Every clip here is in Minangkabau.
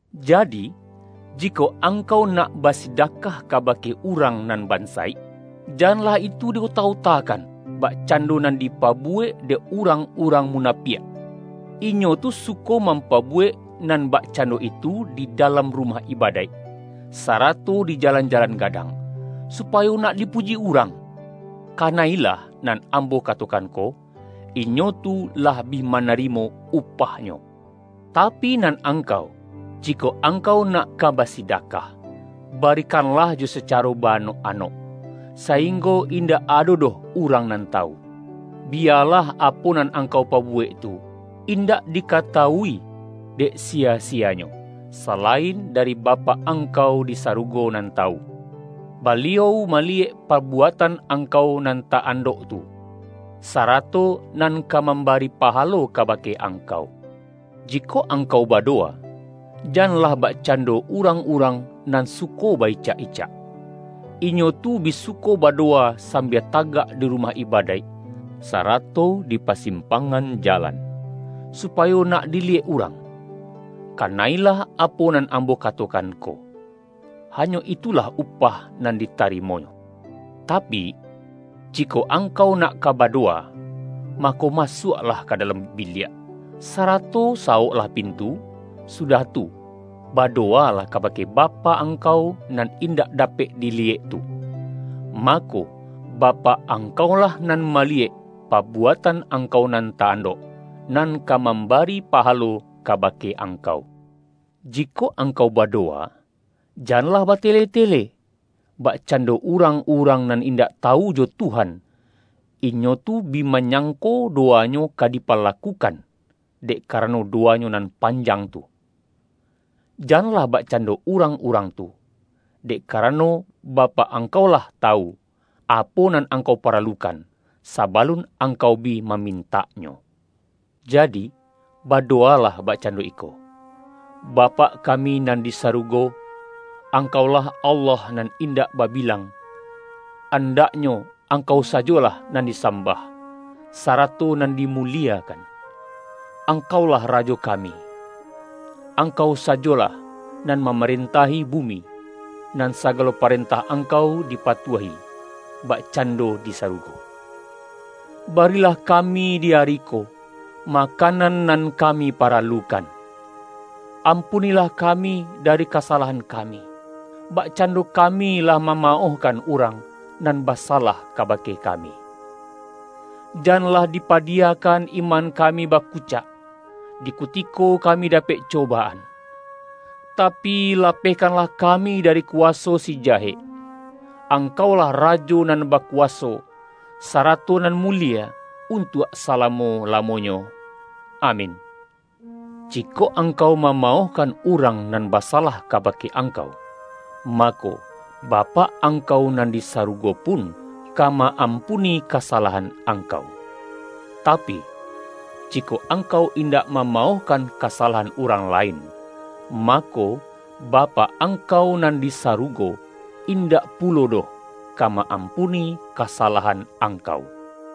Jadi, jikok angkau nak basidakah kabake urang nan bansaik, janlah itu di ota-otakan, bakcando nan dipabu-wek dek urang-urang munapiak. Inyo tu suko mampabuwek nan bakcando itu di dalam rumah ibadaik, sarato di jalan-jalan gadang, supayo nak dipuji urang. Kana-ilah nan Ambo katokan ko, inyo tu lah bi manarimo upahnyo. Tapi, nan angkau, jikok angkau nak ka basidakah, barikanlah jo sacaro ba-anok-anok, sainggo indak ado doh urang nan tawu. Biyalah apo nan ang-kau pabuwek tu, indak dikatawui dek siya-siyanyo, salain dari Bapak ang-kau di sarugo nan tawu. Baliau ma-liyek pabuatan angkau nan ta-andok tu, sarato nan ka mambari pahalo ka-bake angkau.” ”Jikok angkau badowa, janlah bak-cando urang-urang nan suko ba-icak-icak. Inyo tu bi suko badowa sambia tagak di rumah ibadaik, sarato di pa-simpangan jalan, supayo nak diliyek urang. Kana-ilah apo nan Ambo ka-tokan ko, hanyo itulah upah nan di-tarimonyo. Tapi, jikok angkau nak ka badowa, mako, masuaklah ka dalam biliak, sa-rato sawoklah pintu, sudah tu, bado-walah kabake Bapak angkau nan indak dapek diliyek tu. Mako, Bapak ang-kaulah nan maliyek pabuatan angkau nan ta-andok, nan ka mambari paha-lo kabake angkau. Jikok angkau badowa, janlah ba-tele-tele, bakcando urang-urang nan indak tawu jo Tuhan. Inyo tu bi ma-nyangko dowanyo ka dipalakukan, dek karano dowanyo nan panjang tu. Janlah bakcando urang-urang tu. Dek karano, Bapak angkau lah tawu, apo nan angkau paralukan, sabalun ang-kau bi mamintaknyo. Jadi, badowa-lah bakcando iko, ’Bapak kami nan di sarugo: Angkau-lah Allah Nan Indak Babilang. Andaknyo, Angkau sajolah nan disambah, sarato nan dimuliekan. Angkau-lah Rajo kami. Angkau sajolah nan mamarentahi bumi, nan sagalo parentah Angkau dipatuahi, bakcando di sarugo. Barilah kami di ari ko, makanan nan kami paralukan. Ampunilah kami dari kasalahan kami, bakcando kami lah mamaohkan urang nan basalah kabake kami. Janlah dipadiyakan iman kami bakucak, di kutiko kami dapek cobaan, tapi, lapehkanlah kami dari kuwaso si Jahek. [Angkau-lah Rajo nan bakuwaso, sarato nan mulie, untuak salamo-lamonyo. Amin.]' Jikok angkau mamaohkan urang nan basalah kabake angkau, mako, Bapak angkau nan di sarugo pun, ka ma-ampuni kasalahan angkau. Tapi, jikok angkau indak mamaohkan kasa-lahan urang lain, mako, Bapak angkau nan di sarugo, indak pulo doh ka ma-ampuni kasalahan angkau.”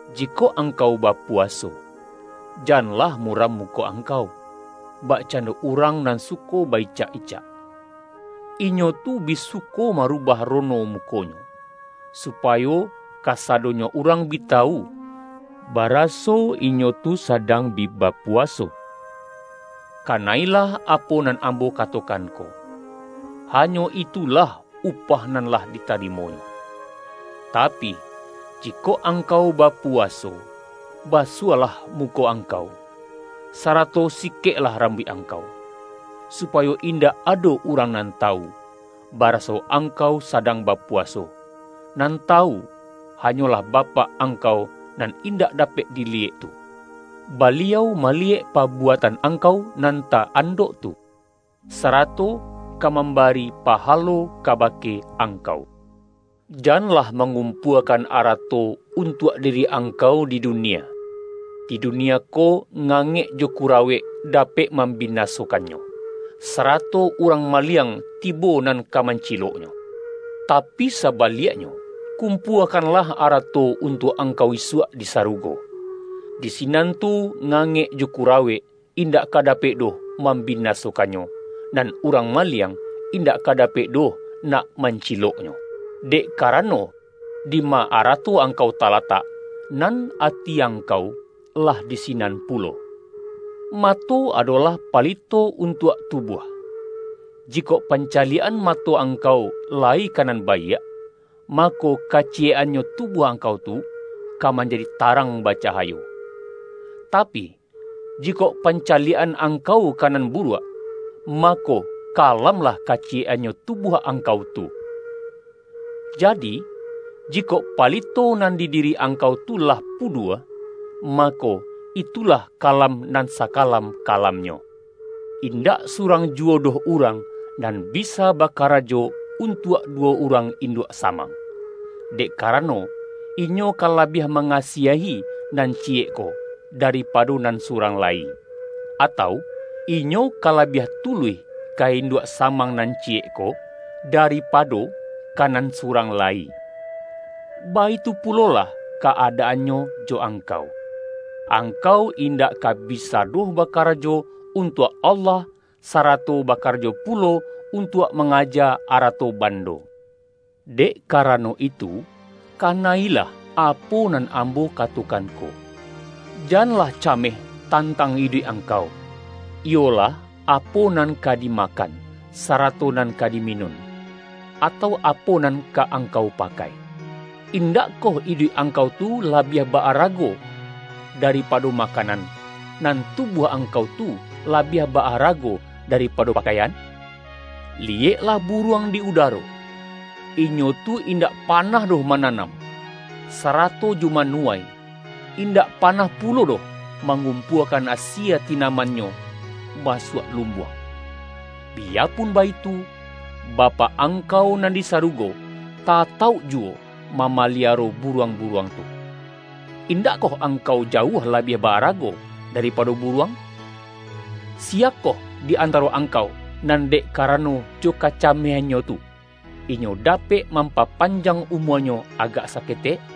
”Jikok angkau bapuwaso, janlah muram muko angkau, bakcando urang nan suko ba-icak-icak. Inyo tu bi suko marubah rono mukonyo, supayo ka-sadonyo urang bi tawu, baraso inyo tu sadang bi bapuwaso. Kana-ilah apo nan Ambo katokan ko, hanyo itulah upah nan lah ditarimonyo. Tapi, ji-kok angkau bapuwaso, basuahlah mu-ko angkau, sarato sikeklah rambuik angkau, supayo indak ado urang nan tawu, baraso angkau sadang ba-puwaso, nan tawu, hanyolah Bapak angkau nan indak dapek diliyek tu. Baliau maliyek pabuatan angkau nan ta-andok tu, sarato ka mambari paha-lo kabake angkau.” ”Janlah mangumpuakan arato un-tuak diri angkau di dunia, di dunia ko, ngangek jo kurawek dapek mam-binasokannyo, sarato urang maliang tibo nan ka manciloknyo. Tapi saba-liaknyo, kumpuakanlah arato untuak angkau isuak di sarugo, di sinan tu, ngangek jo kurawek, indak ka dapek doh mambinasokannyo, nan urang ma-liang, indak ka dapek doh nak man-ciloknyo. Dek karano, dima arato angkau talatak, nan ati angkau lah di sinan pulo!” ”Mato adolah palito untuak tu-buah. Jikok pancaliak-an mato ang-kau layi ka nan baiak, mako, kaciyek-annyo tubuah angkau tu, ka manjadi tarang bacahayo. Tapi, jikok panca-liak-an angkau ka nan buruak, mako, kalamlah kaciyek-annyo tubuah ang-kau tu. Jadi, jikok palito nan di diri angkau tu lah pudua, mako, itulah ka-lam nan sakalam-kalamnyo!” ”Indak surang juwo doh urang nan bisa bakarajo, untuak duwo urang induak samang. Dek karano, inyo ka labiah mangasiahi nan ciyek ko, da-ripado nan surang lai. Atau, inyo ka labiah tuluih ka induak samang nan ciyek ko, daripado ka nan surang lai. Baitu pulolah ka-adaannyo jo angkau. Angkau indak ka bisa doh bakarajo untuak Allah, sarato bakarajo pulo untuak mangaja arato bando. Dek karano itu, kana-ilah apo nan Ambo katokan ko; janlah cameh tan-tang iduik angkau, iyolah, apo nan ka dimakan, sarato nan ka diminun, atau apo nan ka angkau pakai. Indak koh iduik angkau tu labiah ba-arago da-ripado makanan, nan tubuah angkau tu labiah ba-arago daripado pakaian? Liyeklah buruang di udaro. Inyo tu indak panah doh mananam, sarato jo manuwai, indak panah pulo doh, ma-ngumpuakan asie tinamannyo masuak lumbuang. Biyapun baitu, Bapak ang-kau nan di sarugo, tatauk juwo ma-maliaro buruang-buruang tu! Indak koh angkau jauah labiah ba-arago da-ripado buruang? Siyakoh di antaro angkau, nan dek karano jo kacameh-annyo tu, inyo dapek mampapanjang umuanyo agak saketek?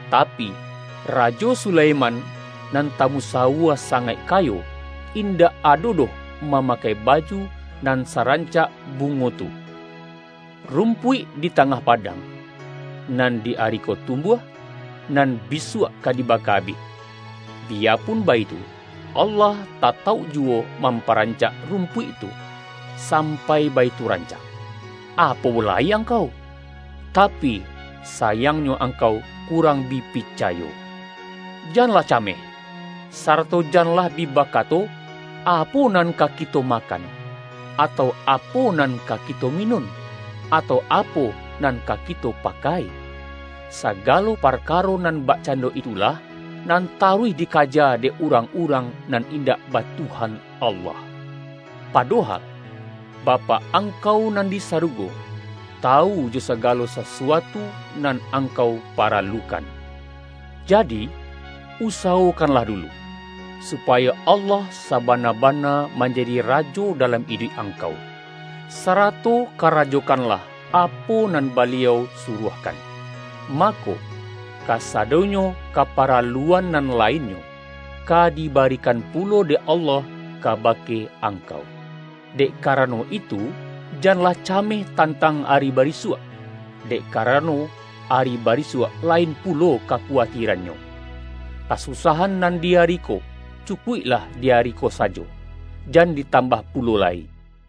tapi, Rajo Sulaiman nan tamusawua sangaik kayo, indak ado doh mamakai baju nan sarancak bu-ngo tu! Rumpuik di tangah padang, nan di ari ko tumbuah, nan bisuak ka dibaka abih. Biyapun baitu, Allah ta-tauk juwo mamparancak rumpuik tu, sampai baitu rancak. Apo lai angkau! Tapi, sayangnyo angkau kurang bi pi-cayo! Janlah cameh, sarato janlah bi bakato, ’Apo nan ka kito makan’, atau ’apo nan ka kito minun’, atau ’apo nan ka kito pakai'? Sagalo parkaro nan bakcando itulah, nan taruih dikaja dek tuang-urang nan indak ba Tuhan Allah. Padohal, Bapak angkau nan di sarugo, tawu jo sagalo sasuatu nan angkau pa-ralukan. Jadi, usawokanlah dulu, su-payo Allah sabana-bana manjadi Rajo dalam iduik angkau, sarato karajokan-lah apo nan Baliau suruahkan. Mako, kasadonyo kaparaluan nan lainnyo, ka dibarikan pulo dek Allah kabake ang-kau. Dek karano itu, janlah cameh tantang ari barisuak. Dek karano ari ba-risuak, lain pulo kakuwatirannyo. Ka-susahan nan di ari ko, cukuiklah di ari ko sajo, jan ditambah pulo lai.”